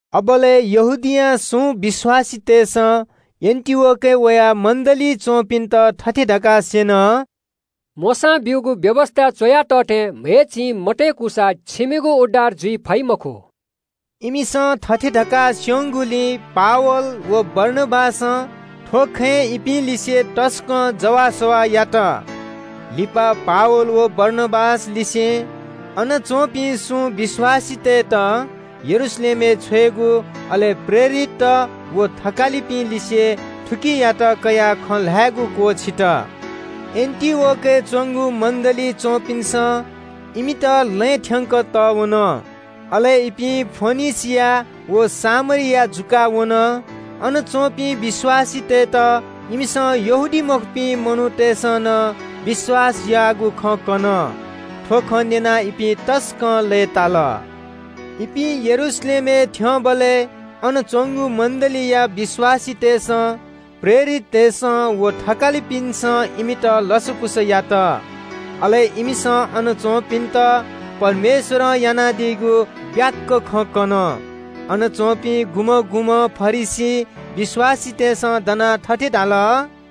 अबलय् यहूदियां सुं विश्‍वासीतय्‌सं एन्‍टिओखियाय् वयाः मण्‍डलीइ च्‍वंपिन्‍त थथे धकाः स्‍यन – “मोशां ब्‍यूगु व्‍यवस्‍थाय् च्‍वया तः थें म्‍हय् चिं मतय्‌कूसा छिमिगु उद्धार जुइ फइ मखु।” इमिसं थथे धकाः स्‍यंगुलिं पावल व बारनाबासं थ्‍व खँय् इपिं लिसे तसकं जवाःसवाः यात। लिपा पावल, बारनाबास व अनं सुं विश्‍वासीतय्‌त यरूशलेमय् छ्वयेगु, अले प्रेरितत व थकालिपिं लिसे थुकियात कयाः खँ ल्‍हायेगु क्‍वःछित। एन्‍टिओखियाय् च्‍वंगु मण्‍डलीयापिन्‍सं इमित अनं बिदा बिल। अले इपिं फोनिके व सामरिया जुयाः वन। अन च्‍वंपिं विश्‍वासीतय्‌त इमिसं यहूदीमखुपिं मनूतय्‌सं नं विश्‍वास याःगु खँ कन। थ्‍व खँ न्‍यनाः इपिं तसकं लय्‌ताल। यरूशलेमय् थ्‍यंबलय् अन च्‍वंगु मण्‍डलीयापिन्‍सं, प्रेरिततय्‌सं व थकालिपिन्‍सं इमित लसकुस यात। अले इमित परमेश्‍वरं यानादीगु फुक्‍क खँ कन। अय्‌नं सुं फरिसी विश्‍वासीतय्‌सं दनाः थथे धाल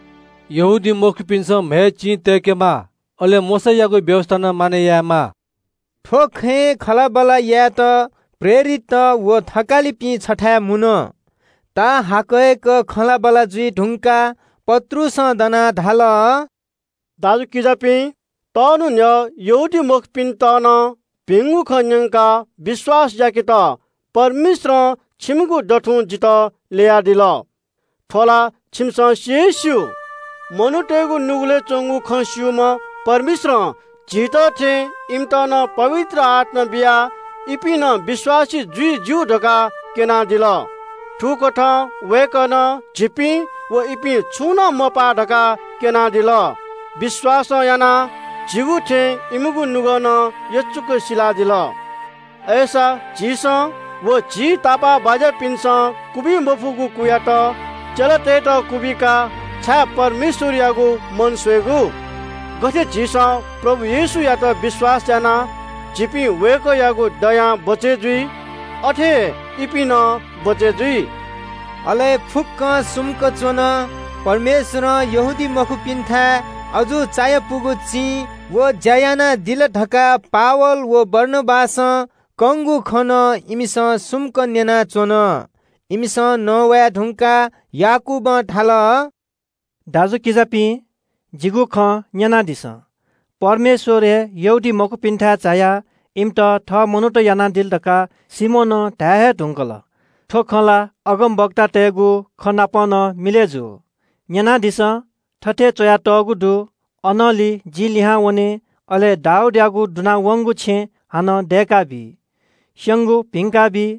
– “यहूदीमखुपिन्‍सं म्‍हय् चिं तय्‌केमाः, अले मोशायागु व्‍यवस्‍था नं मानय् यायेमाः।” थ्‍व खँय् सल्‍लाह यायेत प्रेरितत व थकालिपिं छथाय् मुन। ताःहाकय्‌क खँल्‍हाबल्‍हा जुइ धुंकाः पत्रुसं दनाः धाल – “दाजुकिजापिं, यक्‍व दँ न्‍हापा यहूदीमखुपिन्‍त नं भिंगु खँ न्‍यंकाः विश्‍वास याकेत परमेश्‍वरं छिकपिनिगु दथुं जितः ल्‍ययादिल। थ्‍व ला छिकपिन्‍सं सि हे स्‍यू। मनूतय्‌गु नुगलय् च्‍वंगु खँ स्‍यूम्‍ह परमेश्‍वरं झीत थें इमित नं पवित्र आत्‍मा बियाः इपिं नं विश्‍वासी जुइ ज्‍यू धकाः क्‍यनादिल। थुकथं वय्‌कलं झीपिं व इपिं छुं नं मपाः धकाः क्‍यनादिल। विश्‍वासं यानाः झीगु थें इमिगु नुगः नं यचुक सिलादिल। अय्‌सा झीसं व झी तापाःबाज्‍यापिन्‍सं क्‍वबी मफुगु कुयात चेलातय्‌त क्‍वबिकाः छाय् परमेश्‍वरयागु मन स्‍वयेगु? गथे झीसं प्रभु येशूयात विश्‍वास यानाः झीपिं वय्‌कःयागु दया मायां बचय् जुल, अथे हे इपिं नं बचय् जूगु दु।” अले फुक्‍कं सुम्‍क च्‍वन। परमेश्‍वरं यहूदीमखुपिन्‍थाय् अजू चायापुगु चिं व ज्‍या यानादिल धकाः पावल व बारनाबासं कंगु खँ नं इमिसं ध्‍यान बियाः न्‍यनाच्‍वन। इमिसं नवाये धुंकाः याकूबं धाल – “दाजुकिजापिं, जिगु खँ न्‍यनादिसँ। परमेश्‍वर हे यहूदीमखुपिन्‍थाय् झायाः इमित थः मनूत यानादिल धकाः सिमोनं धाये हे धुंकल। थ्‍व खँ ला अगमवक्तातय्‌गु खँ नाप नं मिलय् जू। न्‍यनादिसँ, थथे च्‍वयातःगु दु – “‘अनंलि जि लिहां वने, अले दाऊदयागु दुना वंगु छेँ हानं दय्‌काबी। स्‍यंगु भिंका बी।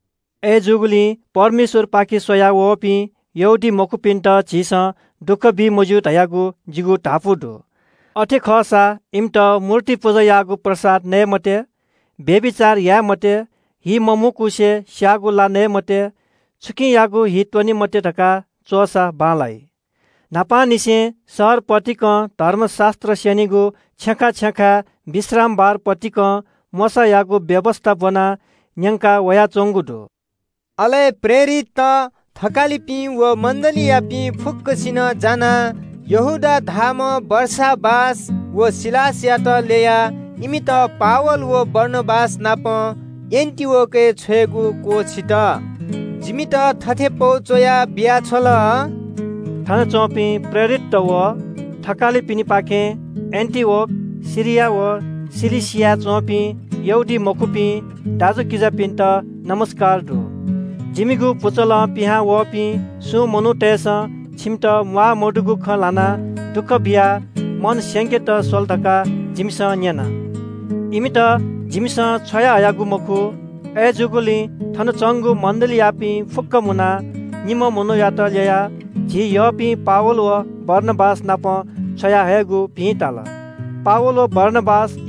“अय्‌जूगुलिं परमेश्‍वरपाखे स्‍वया वःपिं यहूदीमखुपिन्‍त झीसं दुःख बी मज्‍यू धयागु जिगु धापू दु। अथे खःसां इमित मूर्ति पुजायागु प्रसाद नये मते, व्‍यभिचार याये मते, हि मम्‍हुकुसे स्‍याःगु ला नये मते, छुकियागुं हि त्‍वने मते धकाः च्‍वःसा बांलाइ। न्‍हापांनिसें शहर पतिकं धर्मशास्‍त्र स्‍यनीगु छेँय् विश्रामबार पतिकं मोशायागु व्‍यवस्‍था ब्‍वनाः न्‍यंका वयाच्‍वंगु दु।” अले प्रेरितत, थकालिपिं व मण्‍डलीयापिं फुक्‍कसिनं जानाः यहूदा धाःम्‍ह बारसाबास व सिलासयात ल्‍ययाः इमित पावल व बारनाबास नाप एन्‍टिओखियाय् छ्वयेगु क्‍वःछित। जिमित थथे पौ च्‍वया बियाछ्वल – “थनच्‍वंपिं प्रेरितत व थकालिपिनिपाखें एन्‍टिओखिया, सिरिया व किलिकियाय् च्‍वंपिं यहूदीमखुपिं दाजुकिजापिन्‍त ज्‍वजलपा दु। “जिमिगु पुचलं पिहांवःपिं सुं मनूतय्‌सं छिकपिन्‍त म्‍वाःमदुगु खँ ल्‍हानाः दुःख बियाः मन स्‍यंकेत स्‍वल धकाः जिमिसं न्‍यना। इमित जिमिसं छ्वयाहयागु मखु। अय्‌जूगुलिं थन च्‍वंगु मण्‍डलीयापिं फुक्‍कं मुनाः निम्‍ह मनूयात ल्‍ययाः झी यःपिं पावल व बारनाबास नाप छ्वयाहयेगु भिं ताल। पावल व बारनाबासं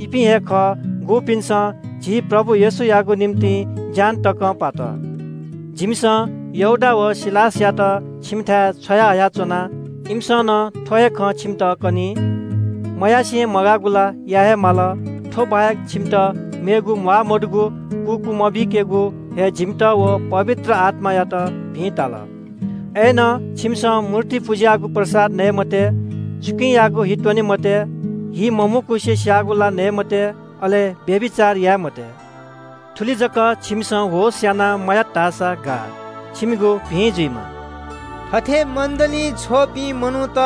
झी प्रभु येशूयागु निंतिं ज्‍यान तकं पात। जिमिसं यहूदा व सिलासयात छिकपिन्‍थाय् छ्वयाहया च्‍वना, इमिसं नं थ्‍व हे खँ छिकपिन्‍त कनी। “मयासें मगाःगु ला याये हे माल, थ्‍व बाहेक छिकपिन्‍त मेगु म्‍वाःमदुगु कु क्‍वमबीकेगु हे जिमित व पवित्र आत्‍मायात भिं ताल। अय्‌नं छिकपिन्‍सं मूर्ति पुजायागु प्रसाद नये मते, छुकियागुं हि त्‍वने मते, हि मम्‍हुकुसे स्‍याःगु ला नये मते, अले व्‍यभिचार याये मते। थुलि जक छिकपिन्‍सं होश यानाः मयात धाःसा गाः। छिकपिनिगु भिं जुइमा।” थथे मण्‍डलीं छ्वःपिं मनूत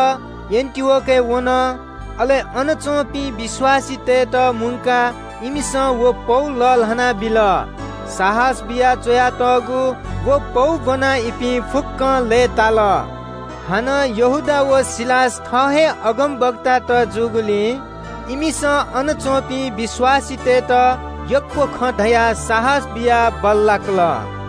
एन्‍टिओखियाय् वन। अले अन च्‍वंपिं विश्‍वासीतय्‌त मुंकाः इमिसं व पौ लःल्‍हाना बिल। साहस बियाः च्‍वयातःगु व पौ ब्‍वनाः इपिं फुक्‍कं लय्‌ताल। हानं यहूदा व सिलास थः हे अगमवक्तात जूगुलिं इमिसं अन च्‍वंपिं विश्‍वासीतय्‌त यक्‍व खँ धयाः साहस बियाः बल्‍लाकल।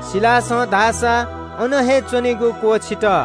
सिलासं धाःसा अन हे च्‍वनेगु क्‍वःछित।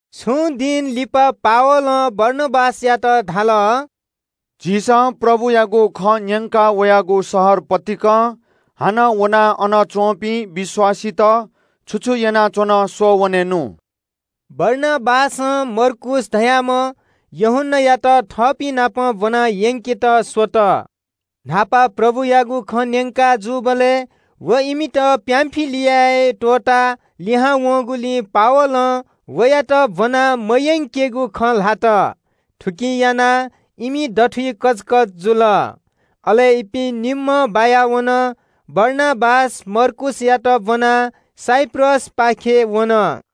छुं दिं लिपा पावलं बारनाबासयात धाल – “झीसं प्रभुयागु खँ न्‍यंका वयागु शहर पतिकं हानं वनाः अन च्‍वंपिं विश्‍वासीत छु छु यानाच्‍वन स्‍वःवनेनु।” बारनाबासं मर्कूस धाःम्‍ह यूहन्‍नायात थःपिं नाप ब्‍वनायंकेत स्‍वल। न्‍हापा प्रभुयागु खँ न्‍यंका जूबलय् व इमित पामफिलियाय् त्‍वःताः लिहां वंगुलिं पावलं वयात ब्‍वना मयंकेगु खँ ल्‍हात। थुकिं यानाः इमि दथुइ कचकच जुल। अले इपिं निम्‍हं बायावन। बारनाबास मर्कूसयात ब्‍वनाः साइप्रसपाखे वन।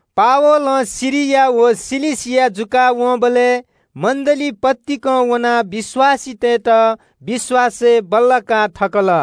इमिसं सिरिया व किलिकिया जुयावंबलय् मण्‍डली पतिकं वनाः विश्‍वासीतय्‌त विश्‍वासय् बल्‍लाका थकल।